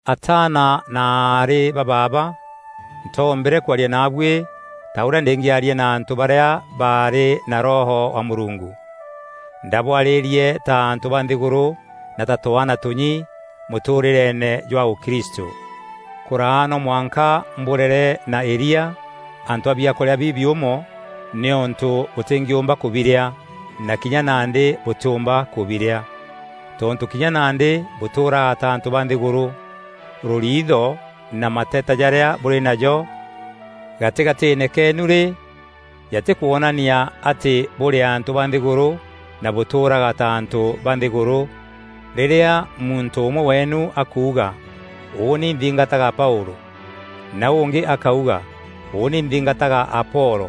Ataana na aarî ba baaba, ntoombîre kwaria naabuî ta ûrîa ndîngîaria na antû barîa barî na Roho wa Mûrungu. Ndaabwarîrie ta antû ba nthîgûrû na ta twaana tûnyi mûtûûrîreene jwa ûkristû. Kûraa no mwanka mbûrere na îria, antû a biakûrîa bibiûmo nîûntû bûtîngîûmba kûbirîa na kinya nandî bûtîûmba kûbirîa. Tontû kinya nandî bûtûûraga ta antû ba nthîgûrû. Rûriitho na mateta jarîa bûrî najo gatîgatîîne keenu rî, jatî kwoonania atî bûrî antû ba nthîgûrû na bûtûûraga ta antû ba nthîgûrû? Rîrîa muntû ûmwe weenu akuuga, “Ûûni nthingataga Paûlû,” na ûngî akauga, “Ûûni nthingataga Apolo,”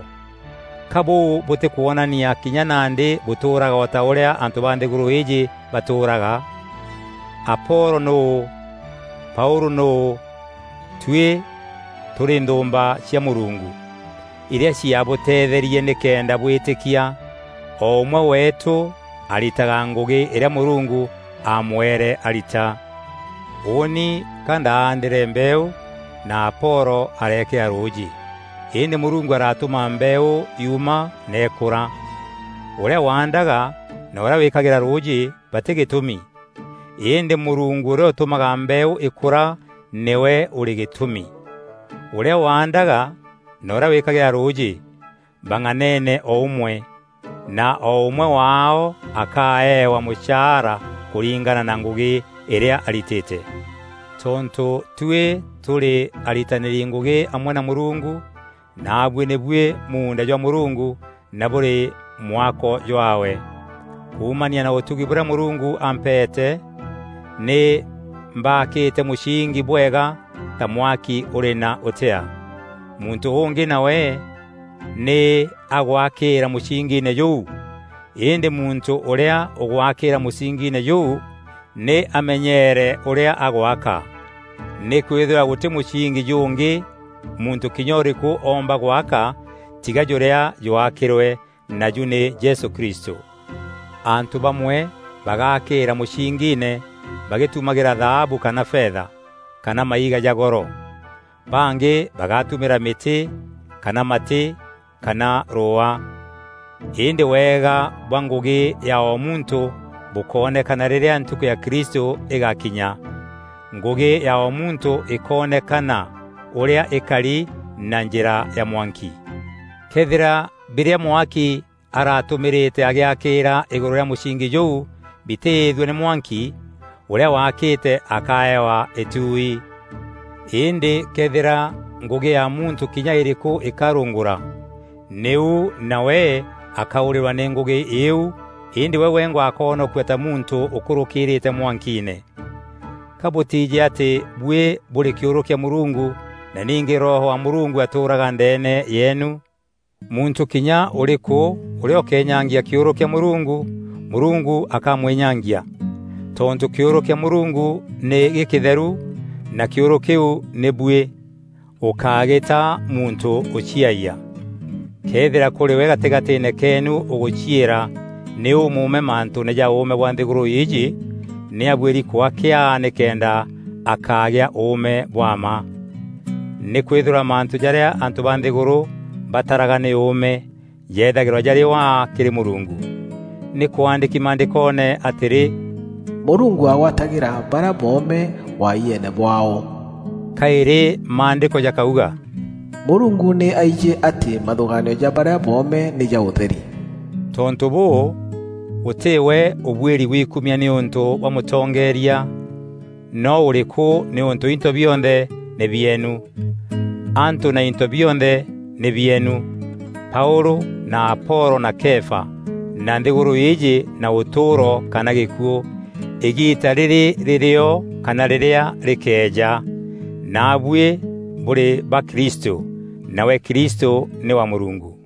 ka bûu bûtîkwonania kinya nandî bûtûûraga o ta ûrîa antû ba nthîgûrû îîjî batûûraga? Apolo nûû? Paûlû nûû? Tuî tûrî nthûûmba cia Mûrungu, irîa ciabuteetherie nîkenda bwîtîkia. O ûmwe weetû aritaga ngûgî irîa Mûrungu aamweere arita. Ûûni ka ndaandîre mbeeû na Apolo areekîra rûûjî, îndî Mûrungu aratûma mbeeû yuuma na îkûra. Ûrîa waandaga na ûrîa wîîkagîra rûûjî batî gîtûmi. Îndî Mûrungu ûrîa ûtûmaga mbeeû îkûra nîwe ûrî gîtûmi. Ûrîa waandaga na ûrîa wîkagîra rûûjî, bang'anene o ûmwe, na o ûmwe waao akaeewa mûchaara kûringana na ngûgî îrîa aritîte. Tontû tuî tûrî aritanîri ngûgî amwe na Mûrungu, naabuî nî buî muunda jwa Mûrungu na bûrî mwako jwaawe. Kuumania na ûtugi bûrîa Mûrungu ampeete, nî mbaakîte mûsingi bwega ta mwaki ûrî na ûtea. Muntû ûngî nawe nî agwakîîra mûsingiine jûu. Îndî muntû ûrîa ûgwaakîîra mûsingiine jûu, nî amenyeere ûrîa agwaka. Nîkwîthîrwa gûtî mûsingi jûngî muntû kinya ûrîkû oomba gwaka tiga jûrîa jwaakîrwe, naju nî Jesû Kristû. Antû bamwe bagaakîîra mûsingiine bagîtumagîra thaabu kana fetha, kana maiga ja goro. Bangî bagatumîra mîtî kana matî kana rûûa. Îndî wega bwa ngûgî ya o muntû bûkoonekana rîrîa ntukû ya Kristû îgakinya. Ngûgî ya o muntû îkoonekana ûrîa îkari na njîra ya mwanki. Këethîra birîa mwaki aratûmîrîte agîakîîra îgûrû rîa mûsingi jûu bitîîthua nî mwanki, ûrîa waakîte akaewa îtuui. Îndî këethîra ngûgî ya muntû kinya ûrîkû îkarûngûra, nîu nawe akaûrîrwa nî ngûgî iu îndî we wengwa akoonokua ta muntû ûkûrûkîrîîte mwankiine. Ka bûtijî atî buî bûrî kîûrû kîa Mûrungu na ningî Roho wa Mûrungu atûûraga ndeene yeenu? Muntû kinya ûrîkû ûrîa ûkeenyangia kîûrû kîa Mûrungu, Mûrungu akamwînyangia. Tontû kîûrû kîa Mûrungu nî gîkîtherû na kîûrû kîu nî buî. Gûkaagîta muntû ûciayia. Këethîra kûrî we gatîgatîîne keenu ûgûciîra nî ûmûûme mantûûne ja ûûme bwa nthîgûrû îîjî nî abuîri kwaa kîaa nîkenda akaagîa ûûme bwa mma. Nîkwîthîrwa mantû jarîa antû ba nthîgûrû bataraga nî ûûme, jethagîrwa jarî waa kîrî Mûrungu. Nî kwandîki Maandîkoone atîrî, “Mûrungu agwatagîra barîa boome wayieene bwaao” Kaîrî Maandîko jakauga, “Mûrungu nî aijî atî mathûgaanio ja barîa boome nî ja ûtheri.” Tontû bûû, gûtî we ûbuîri gwikumia nîûntû bwa mûtongeeria noo ûrîkû nîûntû into bionthe nî bieenu. Antû na into bionthe nî bieenu: Paûlû na Apolo na Kefa, na nthîgûrû îîjî na ûtûûro kana gîkuû, îgiita rîrî rîrîo kana rîrîa rîkeeja. Naabuî bûrî ba Kristû, nawe Kristû nî wa Mûrungu.